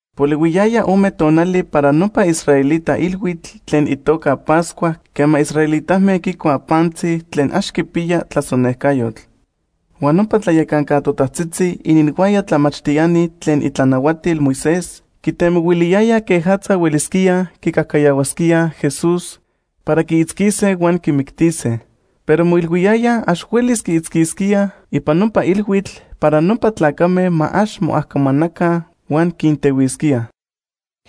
Polihuiyaya ome tonali para nopa israelita ilhuitl tlen itoca Pascua quema israelitame quicuaj pantzi tlen ax quipiya tlasonecajyotl. Huan nopa tlayacanca totajtzitzi ininhuaya tlamachtiani tlen itlanahuatil Moisés quitemohuiliyayaj quejatza huelisquíaj quicajcayahuasquíaj Jesús para quiitzquise huan quimictise. Pero moilhuiyayaj ax huelis quiitzquisquíaj ipan nopa ilhuitl para nopa tlacame ma ax moajcomanaca huan quintehuisquíaj.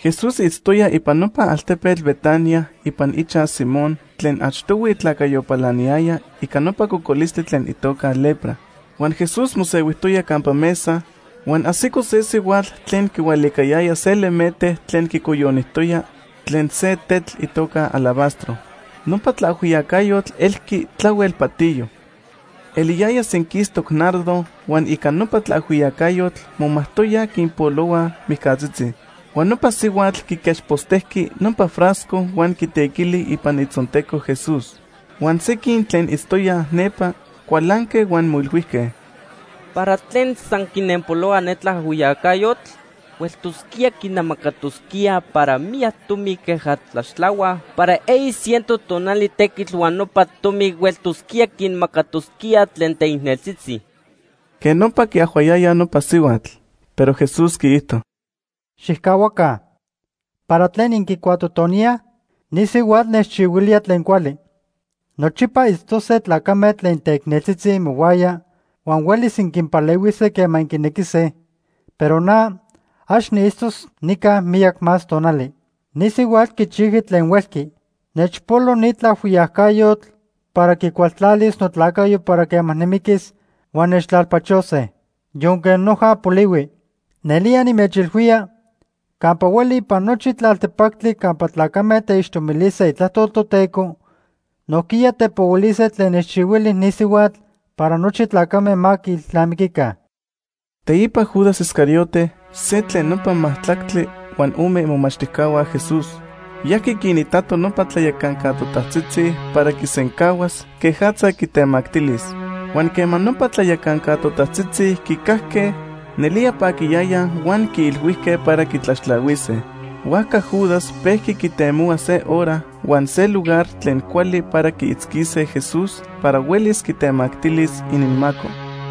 Jesús itztoya ipan nopa altepetl Betania ipan ichaj Simón tlen achtohui tlacayo palaniyaya ica nopa cocolistli tlen itoca lepra. Huan Jesús mosehuijtoya campa mesa, huan ajsico se sihuatl tlen quihualicayaya se lemete tlen quicoyonijtoya tlen se tetl itoca alabastro. Nopa tlaajhuiyacayotl elqui tlahuel patiyo. Eliyaya senquistoc nardo huan ica nopa tlaajhuiyacayotl momajtoyaj quinpolohuaj mijcatzitzi. Huan nopa sihuatl quiquechpostejqui nopa frasco huan quitequili ipan itzonteco Jesús. Huan sequin tlen itztoyaj nepa cualanque huan moilhuijque: ―¿Para tlen san quinenpolohua ne tlaajhuiyacayotl? Hueltosquía quinamacatosquía para miyac tomi queja tlaxtlahuaj para eyi ciento tonali tequitl huan nopa tomi hueltosquía quinmacatosquíaj tlen teicneltzitzi. Quej nopa quiajhuayayaj nopa sihuatl. Pero Jesús quiijto: ―Xijcahuaca, ¿para tlen inquicuatotoníaj? Ni sihuatl nechchihuilía tlen cuali. Nochipa itztose tlacame tlen teicneltzitzi imohuaya huan huelis inquinpalehuise quema inquinequise, pero na, ax niitztos nica miyac más tonali. Ni sihuatl quichijqui tlen huelqui. Nechpolo ni tlaajhuiyacayotl para quicualtlalis notlacayo para quema nimiquis huan nechtlalpachose, yonque noja polihui. Nelía nimechilhuía, campa hueli ipan nochi tlaltepactli campa tlacame teixtomilise itlajtol Toteco, nojquiya tepohuilise tlen nechchihuili ni sihuatl para nochi tlacame ma quiilnamiquica. Teipa Judas Iscariote, se tlen nopa majtlactli huan ome imomachtijcahua Jesús, yajqui quinitato nopa tlayacanca totajtzitzi para quisencahuas quejatza quitemactilis. Huan quema nopa tlayacanca totajtzitzi quicajque, nelía paquiyayaj huan quiilhuijque para quitlaxtlahuise. Huajca Judas pejqui quitemohua se hora huan se lugar tlen cuali para quiitzquise Jesús para huelis quitemactilis ininmaco.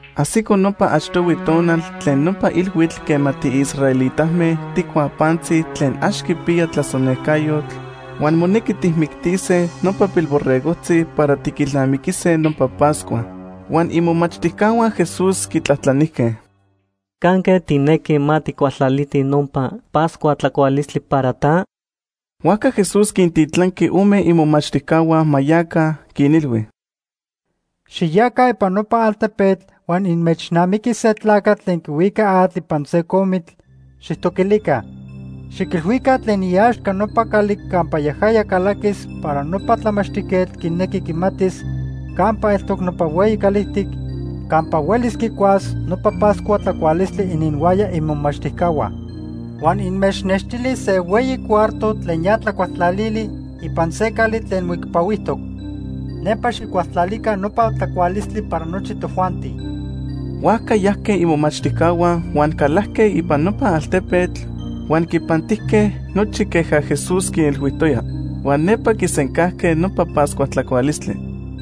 Ajsico nopa achtohui tonal tlen nopa ilhuitl quema tiisraelitame tijcuaj pantzi tlen ax quipiya tlasonejcayotl huan monequi tijmictise nopa pilborregojtzi para tiquilnamiquise nopa Pascua. Huan imomachtijcahua Jesús quitlajtlanijque: ―¿Canque tijnequi ma tijcualtlalitij nopa Pascua tlacualistli para ta? Huajca Jesús quintitlanqui ome imomachtijcahua ma yaca, quinilhui: ―Xiyaca ipan nopa altepetl huan inmechnamiquis se tlacatl tlen quihuica atl ipan se comitl. Xijtoquilica. Xiquilhuica tlen iaxca nopa cali campa yajaya calaquis para nopa tlamachtijquetl quinequi quimatis campa eltoc nopa hueyi calijtic campa huelis quicuas nopa Pascua tlacualistli ininhuaya imomachtijcahua. Huan inmechnextilis se hueyi cuarto tlen ya tlacualtlalili ipan se cali tlen moicpahuijtoc. Nepa xijcualtlalica nopa tlacualistli para nochi tojuanti. Huajca yajque imomachtijcahua huan calajque ipan nopa altepetl huan quipantijque nochi queja Jesús quinilhuijtoya. Huan nepa quisencajque nopa Pascua tlacualistli.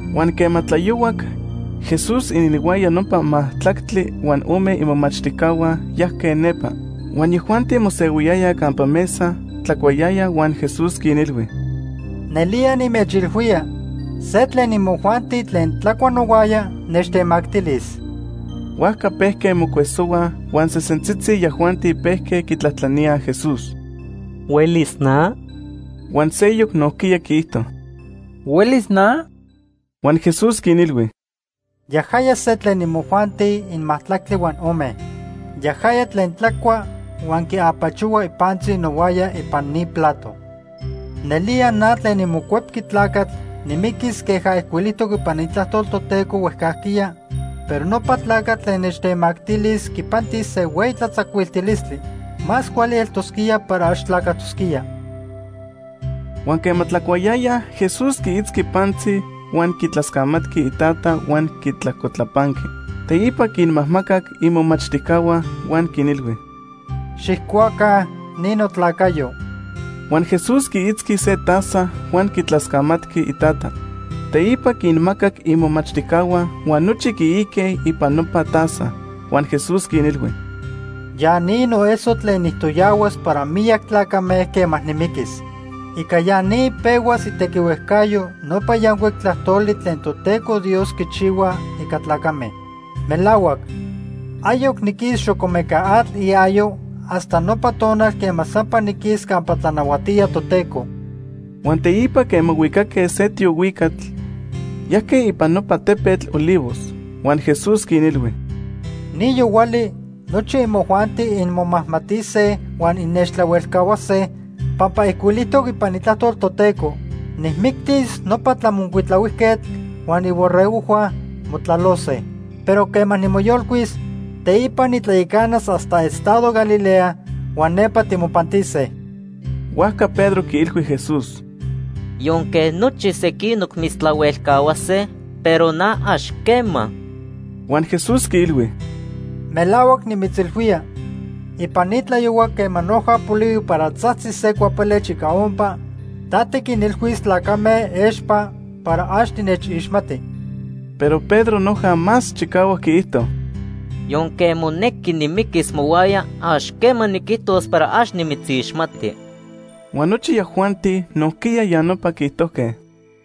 Huan quema tlayohuac, Jesús ininhuaya nopa majtlactli huan ome imomachtijcahua yajque nepa. Huan yajuanti mosehuiyayaj campa mesa tlacuayayaj huan Jesús quinilhui: ―Nelía nimechilhuía, se tlen imojuanti tlen tlacua nohuaya nechtemactilis. Huajca pejque mocuesohuaj huan sesentzitzi yajuanti pejque quitlajtlaníaj Jesús: ―¿Huelis na? Huan seyoc nojquiya quiijto: ―¿Huelis na? Huan Jesús quinilhui: ―Yajaya se tlen imojuanti inmajtlactli huan ome. Yajaya tlen tlacua huan quiapachohua ipantzi nohuaya ipan ni plato. Nelía na tlen niMocuepqui Tlacatl nimiquis queja ijcuilijtoc ipan Itlajtol Toteco huejcajquiya, pero nopa tlacatl tlen nechtemactilis quipantis se hueyi tlatzacuiltilistli. Más cuali eltosquía para ax tlacajtosquía. Huan quema tlacuayayaj, Jesús quiitzqui pantzi, huan quitlascamatqui iTata huan quitlajcotlapanqui. Teipa quinmajmacac imomachtijcahua huan quinilhui: ―Xijcuaca, ni notlacayo. Huan Jesús quiitzqui se taza huan quitlascamatqui iTata. Teipa quinmacac imomachtijcahua huan nochi quiique ipan nopa taza. Huan Jesús quinilhui: ―Ya ni noeso tlen nijtoyahuas para miyac tlacame quema nimiquis. Ica ya ni pehuas itequihuejcayo nopa yancuic tlajtoli tlen Toteco Dios quichihua ica tlacame. Melahuac, ayoc niquis xocomecatl iayo hasta nopa tonal quema sampa niquis campa tlanahuatía Toteco. Huan teipa quema huicaque se tiohuicatl, yajque ipan nopa tepetl Olivos. Huan Jesús quinilhui: ―Ni yohuali nochi imojuanti inmomajmatise huan innechtlahuelcahuase, pampa ijcuilijtoc ipan Itlajtol Toteco: ‘Nijmictis nopa tlamocuitlahuijquetl, huan iborregojhua motlalose.’ Pero quema nimoyolcuis, teipa nitlayacanas hasta estado Galilea, huan nepa timopantise. Huajca Pedro quiilhui Jesús: ―Yonque nochi sequinoc mitztlahuelcahuase, pero na, ax quema. Huan Jesús quiilhui: ―Melahuac nimitzilhuía, ipan ni tlayohua quema noja polihui para tzajtzis se cuapelech ica ompa, ta tiquinilhuis tlacame expa para ax tinechixmati. Pero Pedro noja más chicahuac quiijto: ―Yonque monequi nimiquis mohuaya, ax quema niquijtos para ax nimitzixmati. Huan nochi yajuanti nojquiya ya nopa quiijtojque.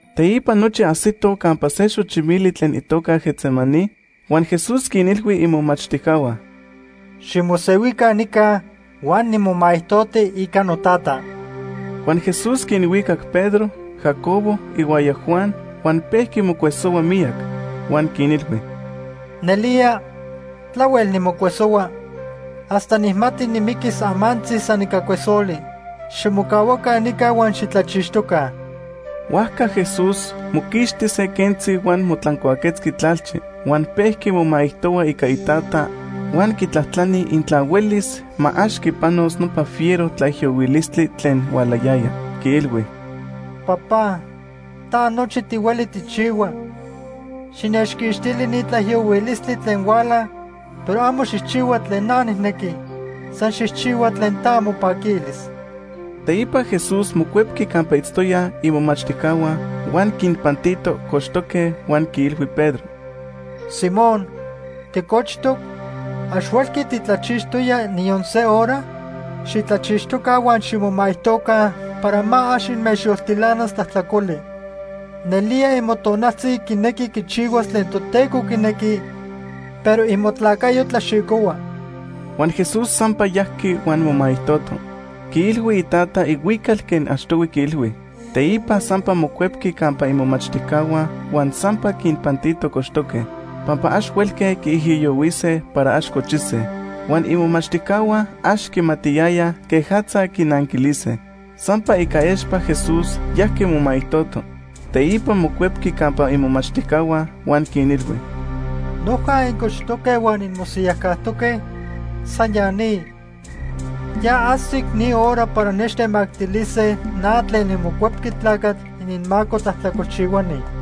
Teipa nochi ajsitoj campa se xochimili tlen itoca Getsemaní huan Jesús quinilhui imomachtijcahua: ―Ximosehuica nica huan nimomaijtoti ica noTata. Huan Jesús quinhuicac Pedro, Jacobo ihuaya Juan huan pejqui mocuesohua miyac. Huan quinilhui: ―Nelía tlahuel nimocuesohua hasta nijmati nimiquis amantzi san ica cuesoli. Ximocahuaca nica huan xitlachixtoca. Huajca Jesús moquixti se quentzi huan motlancuaquetzqui tlalchi. Huan pejqui momaijtohua ica Itata huan quitlajtlani intla huelis, ma ax quipanos nopa fiero tlaijiyohuilistli tlen hualayaya. Quiilhui: “Papá, ta nochi tihueli tijchihua. Xinechquixtili ni tlaijiyohuilistli tlen huala, pero amo xijchihua tlen na nijnequi, san xijchihua tlen ta mopaquilis.” Teipa Jesús mocuepqui campa itztoyaj imomachtijcahua, huan quinpantito cochtoque huan quiilhui Pedro: ―Simón, ¿ticochtoc? ¿Ax huelqui titlachixtoya niyon se hora? Xitlachixtoca huan ximomaijtoca para ma ax inmechyoltilanas tlajtlacoli. Nelía imotonaltzi quinequi quichihuas tlen Toteco quinequi, pero imotlacayo tlaxicohua. Huan Jesús sampa yajqui huan momaijtoto. Quiilhui Itata ihuical quej achtohui quiilhui. Teipa sampa mocuepqui campa imomachtijcahua huan sampa quinpantito cochtoque, pampa ax huelque quiijiyohuise para ax cochise. Huan imomachtijcahua ax quimatiyayaj quejatza quinanquilise. Sampa ica expa Jesús yajqui momaijtoto. Teipa mocuepqui campa imomachtijcahua huan quinilhui: ―¿Noja incochtoque huan inmosiyajcajtoque? San ya ni. Ya ajsic ni hora para nechtemactilise na tlen niMocuepqui Tlacatl ininmaco tlajtlacolchihuani.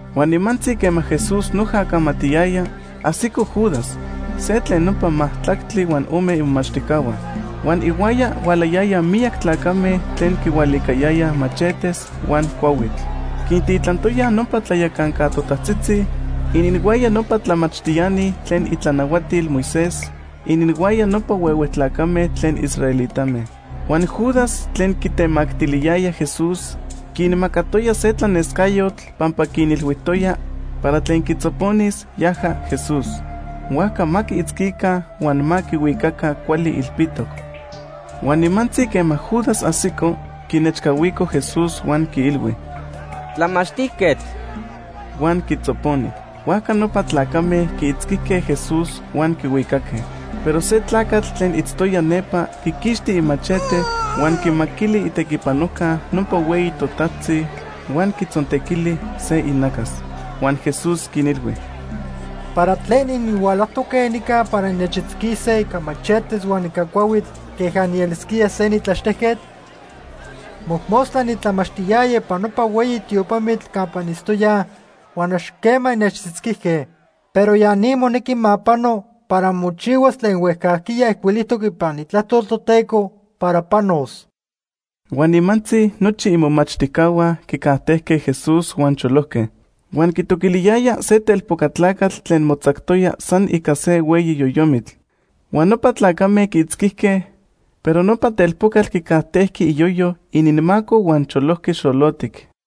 Huan nimantzi quema Jesús noja camatiyaya, ajsico Judas, se tlen nopa majtlactli huan ome imomachtijcahua. Huan ihuaya hualayayaj miyac tlacame tlen quihualicayayaj machetes huan cuahuitl. Quintitlantoyaj nopa tlayacanca totajtzitzi, ininhuaya nopa tlamachtiani tlen itlanahuatil Moisés, ininhuaya nopa huehue tlacame tlen israelitame. Huan Judas tlen quitemactiliyaya Jesús quinmacatoya se tlanescayotl pampa quinilhuijtoya para tlen quitzoponis, yaja Jesús. Huajca ma quiitzquica huan ma quihuicaca cuali ilpitoc. Huan nimantzi quema Judas ajsico, quinechcahuico Jesús huan quiilhui: ―¡Tlamachtijquetl! Huan quitzoponi. Huajca nopa tlacame quiitzquijque Jesús huan quihuicaque. Pero se tlacatl tlen itztoya nepa quiquixti imachete, huan quimaquili itequipanojca nopa hueyi totajtzi huan quitzontequili se inacas. Huan Jesús quinilhui: ―¿Para tlen inhualajtoque nica para innechitzquise ica machetes huan ica cuahuitl queja nielisquía se nitlaxtejquetl? Mojmostla nitlamachtiyaya ipan nopa hueyi tiopamitl campa initztoyaj huan ax quema innechitzquijque. Pero ya ni monequi ma pano para mochihuas tlen huejcajquiya ijcuilijtoc ipan Itlajtol Toteco para panos. Huan nimantzi nochi imomachtijcahua quicajtejque Jesús huan cholojque. Huan quitoquiliyaya se telpoca tlacatl tlen motzactoya san ica se hueyi yoyomitl. Huan nopa tlacame quiitzquijque, pero nopa telpocatl quicajtejqui iyoyo ininmaco huan cholojqui xolotic.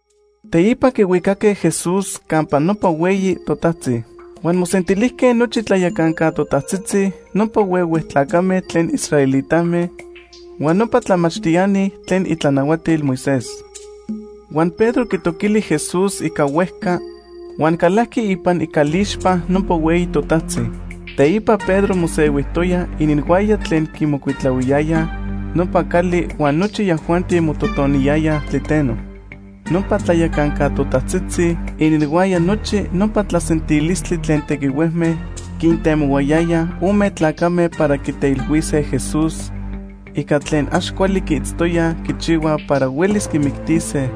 Teipa quihuicaque Jesús campa nopa hueyi totajtzi. Huan mosentilijque nochi tlayacanca totajtzitzi, nopa huehue tlacame tlen israelitame huan nopa tlamachtiani tlen itlanahuatil Moisés. Huan Pedro quitoquili Jesús ica huejca huan calajqui ipan icalixpa nopa hueyi totajtzi. Teipa Pedro mosehuijtoya ininhuaya tlen quimocuitlahuiyayaj nopa cali huan nochi yajuanti mototoniyayaj tliteno. Nopa tlayacanca totajtzitzi ininhuaya nochi nopa tlasentilistli tlen tequihuejme quintemohuayayaj ome tlacame para quiteilhuise Jesús ica tlen ax cuali quiitztoyaj quichihua para huelis quimictise,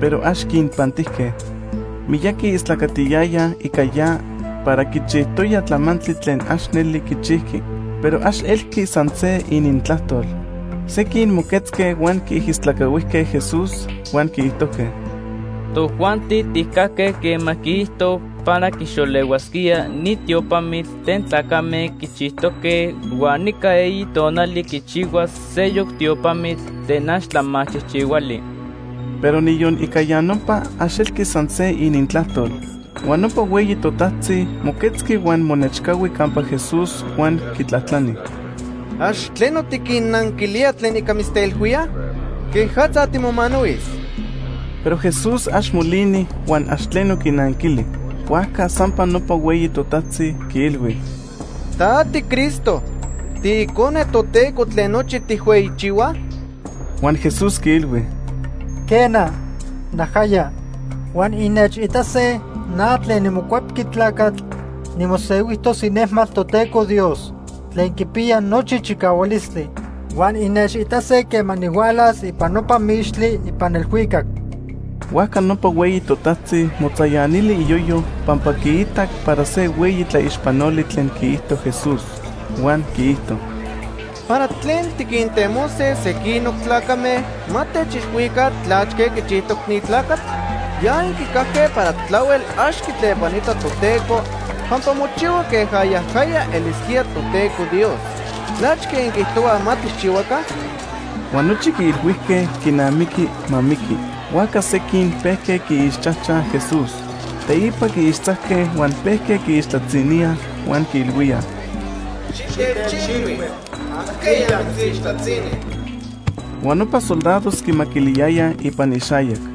pero ax quinpantijque. Miyaqui istlacatiyayaj ica ya para quichijtoya tlamantli tlen ax neli quichijqui, pero ax elqui san se inintlajtol. Sequin moquetzque huan quiijistlacahuijque Jesús, huan quiijtojque: ―Tojuanti tijcajque quema quiijto para quixolehuasquía ni tiopamitl tlen tlacame quichijtoque huan ica eyi tonali quichihuas seyoc tiopamitl tlen ax tlamachijchihuali. Pero niyon ica ya nopa, ax elqui san se inintlajtol. Huan nopa hueyi totajtzi moquetzqui huan monechcahui campa Jesús huan quitlajtlani: ―¿Ax tleno tiquinnanquilía tlen ica mitzteilhuíaj? ¿Quejatza timomanahuis? Pero Jesús ax molini huan ax tleno quinanquili. Huajca sampa nopa hueyi totajtzi quiilhui: ―¿Ta tiCristo, tiIcone Toteco tlen nochi tijhueyichihuaj? Huan Jesús quiilhui: ―Quena, najaya. Huan innechitase na tlen niMocuepqui Tlacatl nimosehuijtos inejmatl Toteco Dios tlen quipiya nochi chicahualistli. Huan innechitase quema nihualas ipan nopa mixtli ipan elhuicac. Huajca nopa hueyi totajtzi motzayanili iyoyo pampa quiitac para se hueyi tlaixpanoli tlen quiijto Jesús. Huan quiijto: ―¿Para tlen tiquintemose sequinoc tlacame ma techilhuica tlachque quichijtoc ni tlacatl? Ya inquicajque para tlahuel ax quitlepanita Toteco pampa mochihua queja yajaya elisquía Toteco Dios. ¿Tlachque inquiijtohuaj ma tijchihuaca? Huan nochi quiilhuijque quinamiqui ma miqui. Huajca sequin pejque quiixchajchaj Jesús. Teipa quiixtzajque huan pejque quiixtlatziníaj huan quiilhuíaj: ―¡Xitechilhui ajqueya mitzixtlatzini! Huan nopa soldados quimaquiliyayaj ipan ixayac.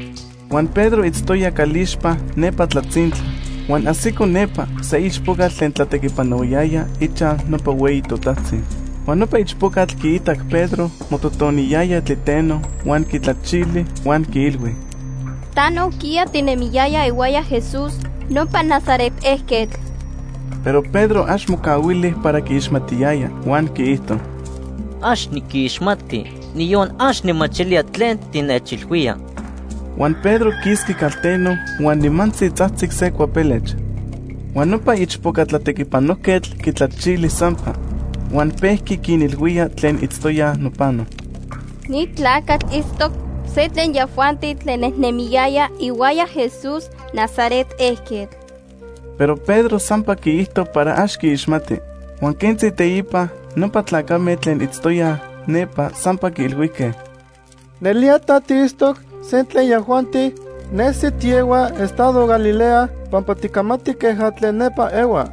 Huan Pedro itztoya calixpa nepa tlatzintla huan ajsico nepa se ichpocatl tlen tlatequipanohuayaya ichaj nopa hueyi totajtzi. Huan nopa ichpocatl quiitac Pedro mototoniyaya tliteno huan quitlachili huan quiilhui: ―Ta nojquiya tinemiyaya ihuaya Jesús, nopa Nazaret ejquetl. Pero Pedro ax mocahuili para quiixmatiyaya, huan quiijto: ―Ax niquixmati, niyon ax nijmachilía tlen tinechilhuía. Huan Pedro quisqui calteno huan nimantzi tzajtzic se cuapelech. Huan nopa ichpoca tlatequipanojquetl quitlachili sampa huan pejqui quinilhuía tlen itztoyaj nopano: ―Ni tlacatl itztoc se tlen yajuanti tlen nejnemiyayaj ihuaya Jesús Nazaret ejquetl. Pero Pedro sampa quiijto para ax quiixmati. Huan quentzi teipa, nopa tlacame tlen itztoyaj nepa sampa quiilhuijque: ―Nelía ta tiitztoc se tlen yajuanti. Nesi tiehua estado Galilea pampa ticamati queja tlen nepa ehuaj.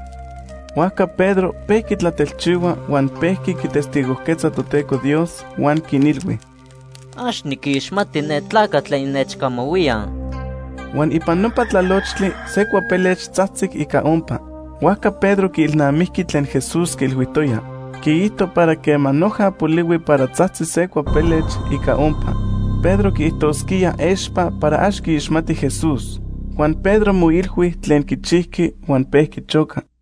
Huajca Pedro pejqui tlatelchihua huan pejqui quitestigojquetza Toteco Dios huan quinilhui: ―Ax niquixmati ne tlacatl tlen innechcamahuíaj. Huan ipan nopa tlalochtli se cuapelech tzajtzic ica ompa. Huajca Pedro quiilnamijqui tlen Jesús quiilhuijtoya. Quiijto para quema noja polihui para tzajtzis se cuapelech ica ompa, Pedro quiijtosquía expa para ax quiixmati Jesús. Huan Pedro moilhui tlen quichijqui huan pejqui choca.